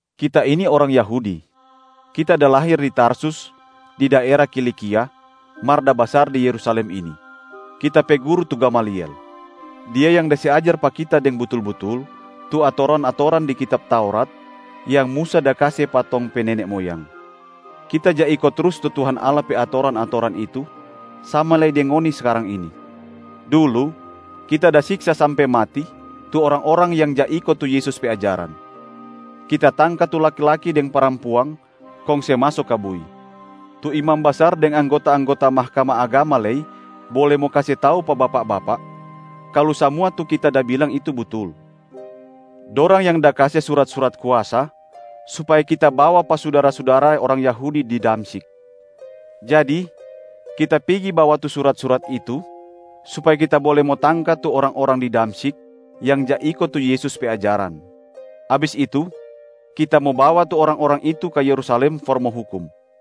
“Kita ini orang Yahudi. Kita da lahir di Tarsus di daera Kilikia, mar da basar di Yerusalem ini. Kita pe guru tu Gamaliel. Dia yang da se ajar pa kita deng butul-butul tu atoran-atoran di kitab Taurat yang Musa da kase pa tong pe nene moyang. Kita ja iko trus tu Tuhan Allah pe atoran-atoran itu sama lei deng ngoni skarang ini. Dulu, kita da siksa sampe mati tu orang-orang yang ja iko tu Yesus pe ajaran. Kita tangka tu laki-laki deng parampuang kong se maso ka bui. Tu imam basar deng anggota-anggota Mahkamah Agama lei bole mo kase tau pa bapak-bapak kalu samua tu kita da bilang itu butul. Dorang yang da kase surat-surat kuasa supaya kita bawa pa sudara-sudara orang Yahudi di Damsyik. Jadi kita pigi bawa tu surat-surat itu supaya kita bole mo tangka tu orang-orang di Damsyik yang ja iko tu Yesus pe ajaran, abis itu kita mo bawa tu orang-orang itu ka Yerusalem for mo hukum.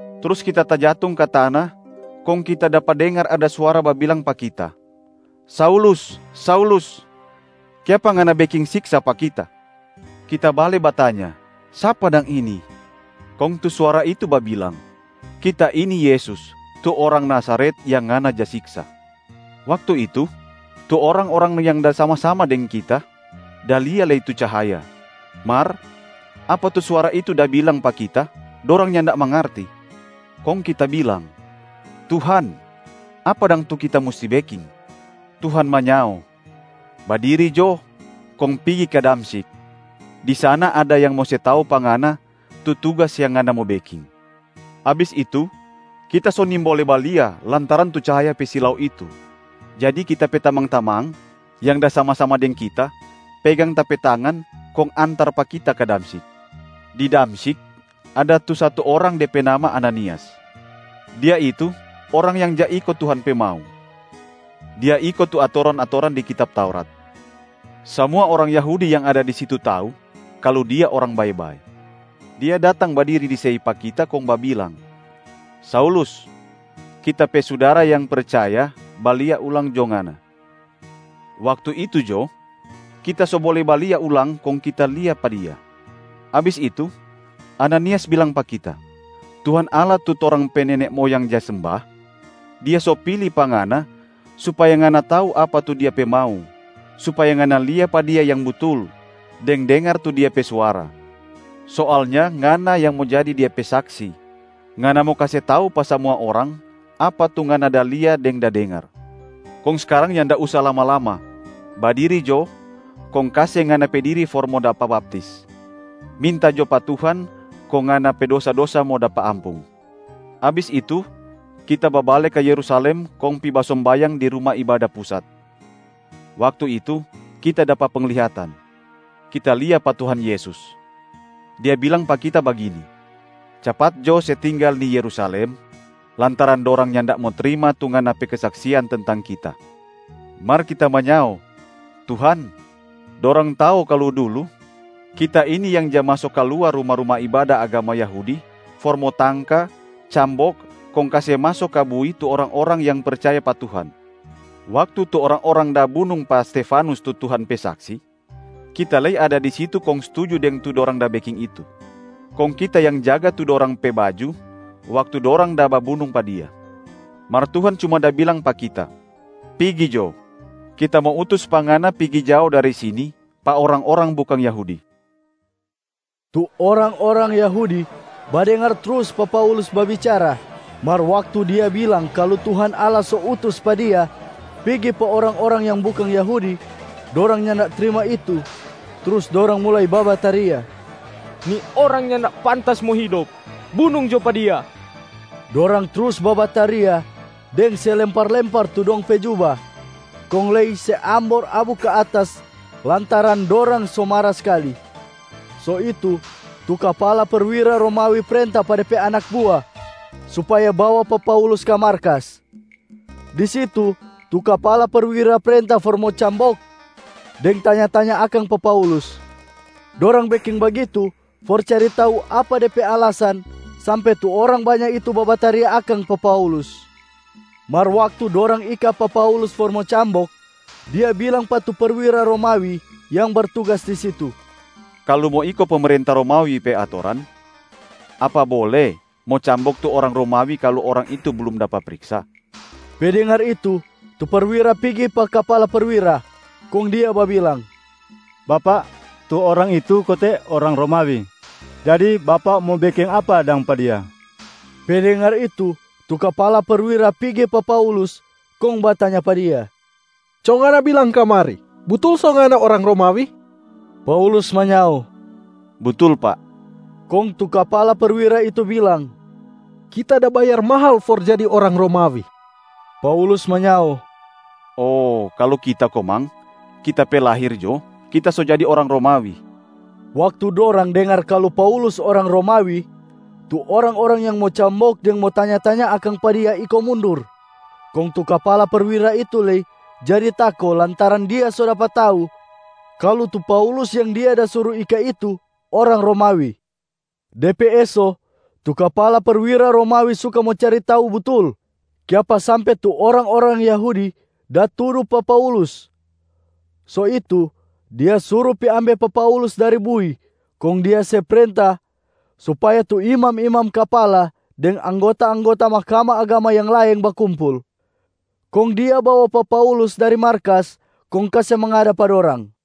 Trus kita tajatung ka tana kong kita dapa dengar ada suara babilang pa kita, ‘Saulus, Saulus, kiapa ngana beking siksa pa Kita?’ Kita bale batanya, ‘Sapa dang ini?’ Kong tu suara itu babilang, ‘Kita ini Yesus, tu orang Nazaret yang ngana ja siksa.’ Waktu itu, tu orang-orang yang da sama-sama deng kita da lia lei tu cahaya, mar apa tu suara itu da bilang pa kita dorang nyanda mangarti. Kong kita bilang, ‘Tuhan, apa dang tu kita musti beking?’ Tuhan manyao, ‘Badiri jo kong pigi ka Damsyik. Di sana ada yang mo se tau pa ngana tu tugas yang ngana mo beking.’ Abis itu, kita so nimbole balia lantaran tu cahaya pe silau itu. Jadi kita pe tamang-tamang yang da sama-sama deng kita pegang ta pe tangan kong antar pa kita ka Damsyik. Di Damsyik, ada tu satu orang de pe nama Ananias. Dia itu orang yang ja iko Tuhan pe mau, dia iko tu atoran-atoran di kitab Taurat. Samua orang Yahudi yang ada di situ tau kalu dia orang bae-bae. Dia datang badiri di sei pa kita kong babilang, ‘Saulus, kita pe sudara yang percaya, balia ulang jo ngana!’ Waktu itu jo, kita so bole balia ulang kong kita lia pa dia. Abis itu, Ananias bilang pa kita, ‘Tuhan Allah tu torang pe nene moyang ja semba, Dia so pili pa ngana supaya ngana tau apa tu Dia pe mau, supaya ngana lia pa Dia Yang Butul, deng dengar tu Dia pe suara. Soalnya ngana yang mo jadi Dia pe saksi, ngana mo kase tau pa samua orang apa tu ngana da lia deng da dengar. Kong skarang nyanda usa lama-lama, badiri jo kong kase ngana pe diri for mo dapa baptis, minta jo pa Tuhan kong ngana pe dosa-dosa mo dapa ampung.’ Abis itu, kita babale ka Yerusalem kong pi basombayang di Ruma Ibada Pusat. Waktu itu kita dapa penglihatan, kita lia pa Tuhan Yesus. Dia bilang pa kita bagini, ‘Capat jo se tinggal ni Yerusalem, lantaran dorang nyanda mo trima tu ngana pe kesaksian tentang Kita.’ Mar kita manyao, ‘Tuhan, dorang tau kalu dulu kita ini yang ja maso kaluar ruma-ruma ibada agama Yahudi for mo tangka, cambok kong kase maso ka bui tu orang-orang yang percaya pa Tuhan. Waktu tu orang-orang da bunung pa Stefanus tu Tuhan pe saksi, kita lei ada di situ kong stuju deng tu dorang da beking itu. Kong kita yang jaga tu dorang pe baju waktu dorang da babunung pa dia.’ Mar Tuhan cuma da bilang pa kita, ‘Pigi jo, Kita mo utus pa ngana pigi jao dari sini pa orang-orang bukang Yahudi.’” Tu orang-orang Yahudi badengar trus pa Paulus babicara, mar waktu dia bilang kalu Tuhan Allah so utus pa dia pigi pa orang-orang yang bukang Yahudi, dorang nyanda trima itu trus dorang mulai babataria, “Ni orang nyanda pantas mo hidop, bunung jo pa dia!” Dorang trus babataria deng se lempar-lempar tu dong pe juba, kong lei se ambor abu ka atas lantaran dorang so mara skali. So itu tu kapala perwira Romawi prenta pa de pe anak bua supaya bawa pa Paulus ka markas. Di situ, tu kapala perwira prenta for mo cambok deng tanya-tanya akang pa Paulus. Dorang beking bagitu for cari tau apa de pe alasan sampe tu orang banya itu babataria akang pa Paulus. Mar waktu dorang ika pa Paulus for mo cambok, dia bilang pa tu perwira Romawi yang bertugas di situ, “Kalu mo iko pemerenta Romawi pe atoran, apa bole mo cambok tu orang Romawi kalu orang itu blum dapa priksa?” Pe dengar itu, tu perwira pigi pa kapala perwira, kong dia babilang, “Bapak, tu orang itu kote orang Romawi. Jadi bapak mo beking apa dang pa dia?” Pe dengar itu, tu kapala perwira pigi pa Paulus kong batanya pa dia, “Co ngana bilang kamari, butul so ngana orang Romawi?” Paulus manyao, “Butul pak.” Kong tu kapala perwira itu bilang, “Kita da bayar mahal for jadi orang Romawi!” Paulus manyao, “Oh kalu kita komang, kita pe lahir jo, kita so jadi orang Romawi.” Waktu dorang dengar kalu Paulus orang Romawi, tu orang-orang yang mo cambok deng mo tanya-tanya akang pa dia iko mundur. Kong tu kapala perwira itu lei jadi tako lantaran dia so dapa tau kalu tu Paulus yang dia da suru ika itu orang Romawi. De pe eso, tu kapala perwira Romawi suka mo cari tau butul, kiapa sampe tu orang-orang Yahudi da tudu pa Paulus. So itu, dia suru pi ambe pa Paulus dari bui kong dia se prenta supaya tu imam-imam kapala deng anggota-anggota Mahkamah Agama yang laeng bakumpul. Kong dia bawa pa Paulus dari markas kong kase mangada pa dorang.